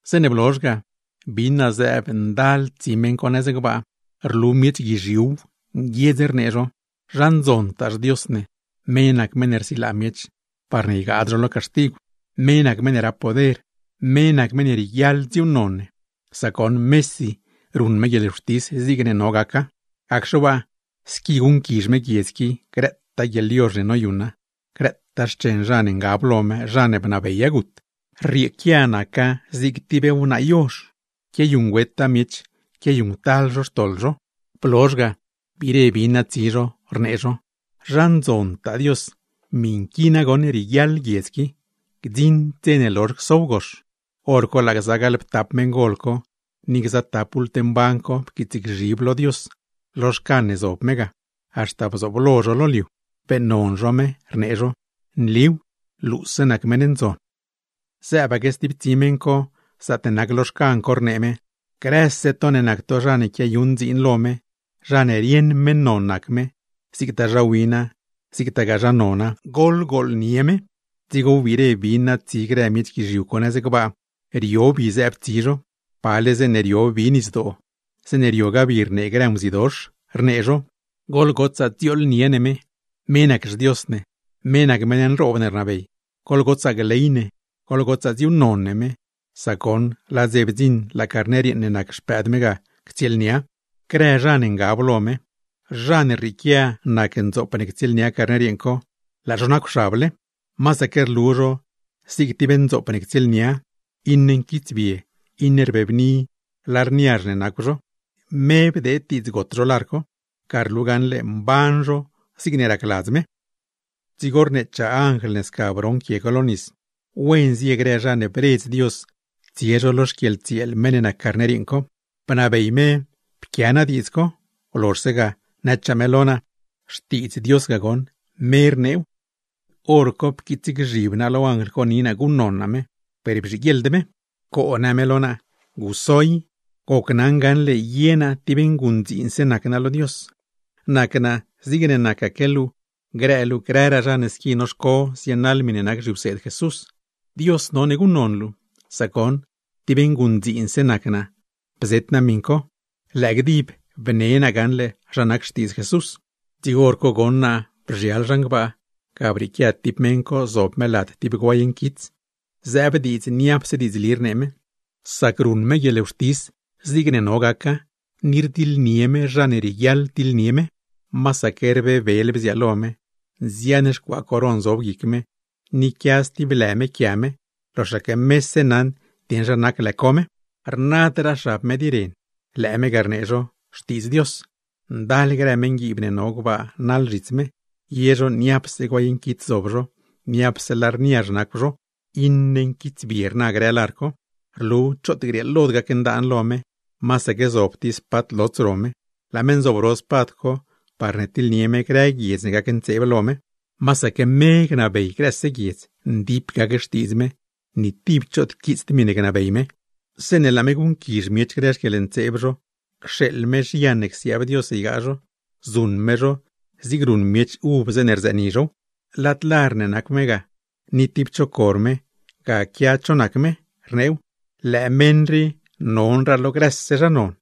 Zeeṉe blozh ga, bin naa zëëb ndal tsi meṉ co nëz gbaa, rlu miech guizhiuw, nguiedz rnee zho: ¡Zha ndzontaa xDios ne! Me nac meṉ ne rsilaa miech, parne ygaad zho lo caxtigw. Me nac meṉ ne rap poder, me nac meṉ ne rieguiaḻ dziuuṉnon ne; sac goṉ mesi ruṉ me guieḻwxtis zigne no gaca. Gacxe waa, sca guṉquizh me guiedz qui grëtaa guieḻyozh ne noyuṉa, grëtaa xchen zha ne ngab lo me, zha ne bnabeya gut; rrieequia naca zig tib wnaa yozh, quiayuṉgüeta miech quiayuṉctal zho xtoḻ zho. Blozh ga, biire bin naa tsi zho, rnee zho: ¡Zha ndzontaa Dios! ¡Miṉ qui nagoṉ rieguiaḻa, gdziṉd dze ne lozh csow gox! Horco laa gza gaḻptap meṉgol co, ni gza tap bult mban co pquiitsgzhib lo Dios lo xcan ne zob me ga, haxta bzooblo zho lo liu, beeṉnon zho me, rnee zho: “¡Nliw! ¡Luuse nac meṉ ne ndzon!” Zëëbaque stib tsi meṉ co zaatne nac lo xcan co, rnee me: ¡Grëse to ne nac to zha ne quiayuṉ dziin lo me, zha ne rieṉ meṉ non nac me, zigtaa zha wina, zigtagaa zha nona, goḻgooḻnie me! Dzigo wbiire bin naa tsi grë miech guizhiu co nëz gbaa, rio bi zëëb tsi zho, pale zeeṉe rio bi nisdoo, zeeṉe riogaa bi rnee grë nguzidox, rnee zho: ¡Goḻgotsaa dziooḻnie ne me! ¡Me nac xDios ne, me nac meṉ nroob ne rnabey! Goḻgotsaa gley ne, goḻgotsaa dziuuṉnon ne me, sac goṉ laa dze bdziṉ laa Carner yeeṉ ne nac Xpëëd me ga ctsieelnia; grë zha ne ngab lo me, zha ne rrieequia nac ndzoop ne ctsieelnia Carner yeeṉ co, laa zho nacwxable. Masaque rlu zho zig tib ndzoop ne ctsieelnia, iṉe nquitsbie, iṉe rbebni lar niazh ne nacw zho; me bdeed diidz got zho lar co, ga rlu gaṉle mban zho zigne racladz me. Dzigo rneechaa anjl ne sca broṉ quie co lo nis: ―Wen zie grë zha ne bredz Dios tsie lo xquieḻtsieel meṉ ne nac Carner yeeṉ co. Bnabey me naa pquia naa diidz co, blozhse ga, nëchaa me lo naa: ―Xtiidz Dios ga goṉ, me rneew. Horco pquiitsgzhib naa lo anjl co ni naa guṉnon naa me, per bzhiguieḻd me. ―¡Coo! ―në me lo naa―. ¡Guso i! Gocnaṉ gaṉle ye naa tib nguṉdziinse nac naa lo Dios, nac naa zigne nacaque luu grë luu grëraa zha ne squi noxco zienaḻ miṉe nac zhiwseed Jesús. Dios none guṉnon luu, sac goṉ tib nguṉdziinse nac naa bzet naa miṉ co, lëë gdib bne naa gaṉle zha nac xtiidz Jesús. Dzigo hor co goṉ naa bzhial zhan gbaa, ga brieequia tib meṉ co zob me lad tib guay nquits, zëëb diidz niapse diidzli rnee me, sac ruṉ me guieḻwxtis zigne no gaca, ni rdiḻnie me zha ne rieguiaḻ tiḻnie me. Masaque rbebel bziaalo me, nzian xcuaa coron zob guic me, ni quia stib lë me quia me, loxaque mese naṉ dieṉ zha nac lë co me. Rnadraa xab me di ren, lëë me ga rnee zho: Xtiidz Dios. Ndal grë meṉguiib ne no gbaa naḻ zhits me, ye zho niapse guay nquits zob zho; niapse lar niazh nacw zho, iṉe nquitsbie rna grë lar co. Rlu choot grieelod gacndaan lo me, masaque zob tib spad lots ro me, laa me nzobro spad co parne tiḻnie me grë guiedz ne gacntseeb lo me. Masaque me gnabey grëse guiedz, ndip gac xtiidz me, ni tib choot quiitsd miṉe gnabey me; zeeṉe laa me guṉquizh miech grë xquieḻntseeb zho, cxeeḻ me zhian ne csiaab Dios ygaa zho, zuṉ me zho zigne ruṉ miech uv zeeṉe rzëëni zhow. Lad lar ne nacw me ga, ni tib cho cor me, ga quia cho nac me, rneew: “LËË MEṈ RII NONRAA LO GRËSE ZHA NON,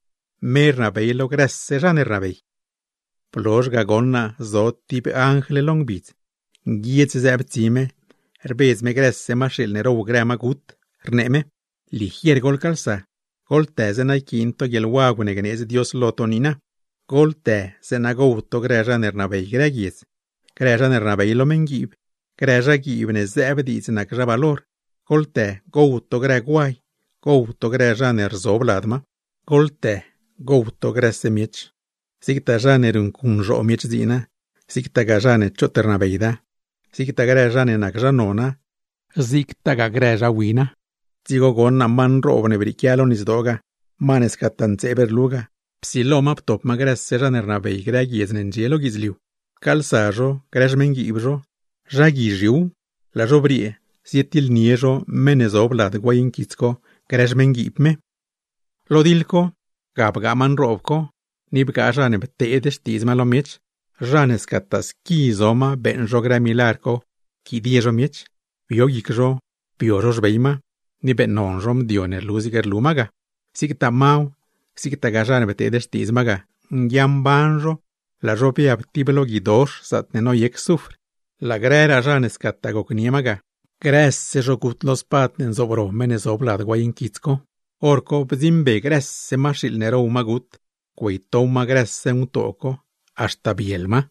ME RNABEY LO GRËSE ZHA NE RNABEY.” Blozh ga goṉ naa zo tib anjl lo ngbidz, nguiedz zëëb tsi me rbedz me grëse maxiiḻ ne row grë magut, rnee me: ―¡Ligier goḻcaalsa! ¡Goḻtë zeeṉa yquiin to guieḻwagw ne gneedz Dios lo to niina! Goḻtë zeeṉa gow to grë zha ne rnabey grë guiedz, grë zha ne rnabey lo meṉguiib, grë zhaguiib ne zëëb diidz nac zha valor; goḻtë gow to grë guay, gow to grë zha ne rzob lad ma. Goḻtë gow to grëse miech, zigtaa zha ne ruṉcuṉzhoo miech dziina, zigtagaa zha ne choot rnabeyda, zigtaa grë zha ne nac zha nona, zigtagaa grë zha wina. Dzigo goṉ naa ma nroob ne brieequia lo nisdoo ga, ma ne scataa ntseeb rlu ga, psilo ma ptop ma grëse zha ne rnabey grë guiedz ne ndxie lo guidzliu. Pcaalsa zho grë xmeṉguiib zho, zha guizhiuw, laa zho briee zietiḻnie zho meṉ ne zob lad guay nquits co grë xmeṉguiib me. Lo diḻ co, ga bgaa ma nroob co, ni bgaa zha ne pteed xtiidz ma lo miech; zha ne scataa squi zo ma beeṉ zho grë milagr co pquidie zho miech, bio guic zho bio zho xbey ma, ni beeṉnon zho mdio ne rlu zig rlu ma ga. Zigtaa maw, zigtaa zha ne pteed xtiidz ma ga, nguia mban zho laa zho biab tib lo guidox zaatne noyec zufr. Laa grëraa zha ne scataa gocnie ma ga, grëse zho gut lo spad ne nzobro meṉ ne zob lad guay nquits co, hor co bdziṉbe grëse maxiiḻ ne row magut, güeytow ma grëse ngutoo co haxta biel ma.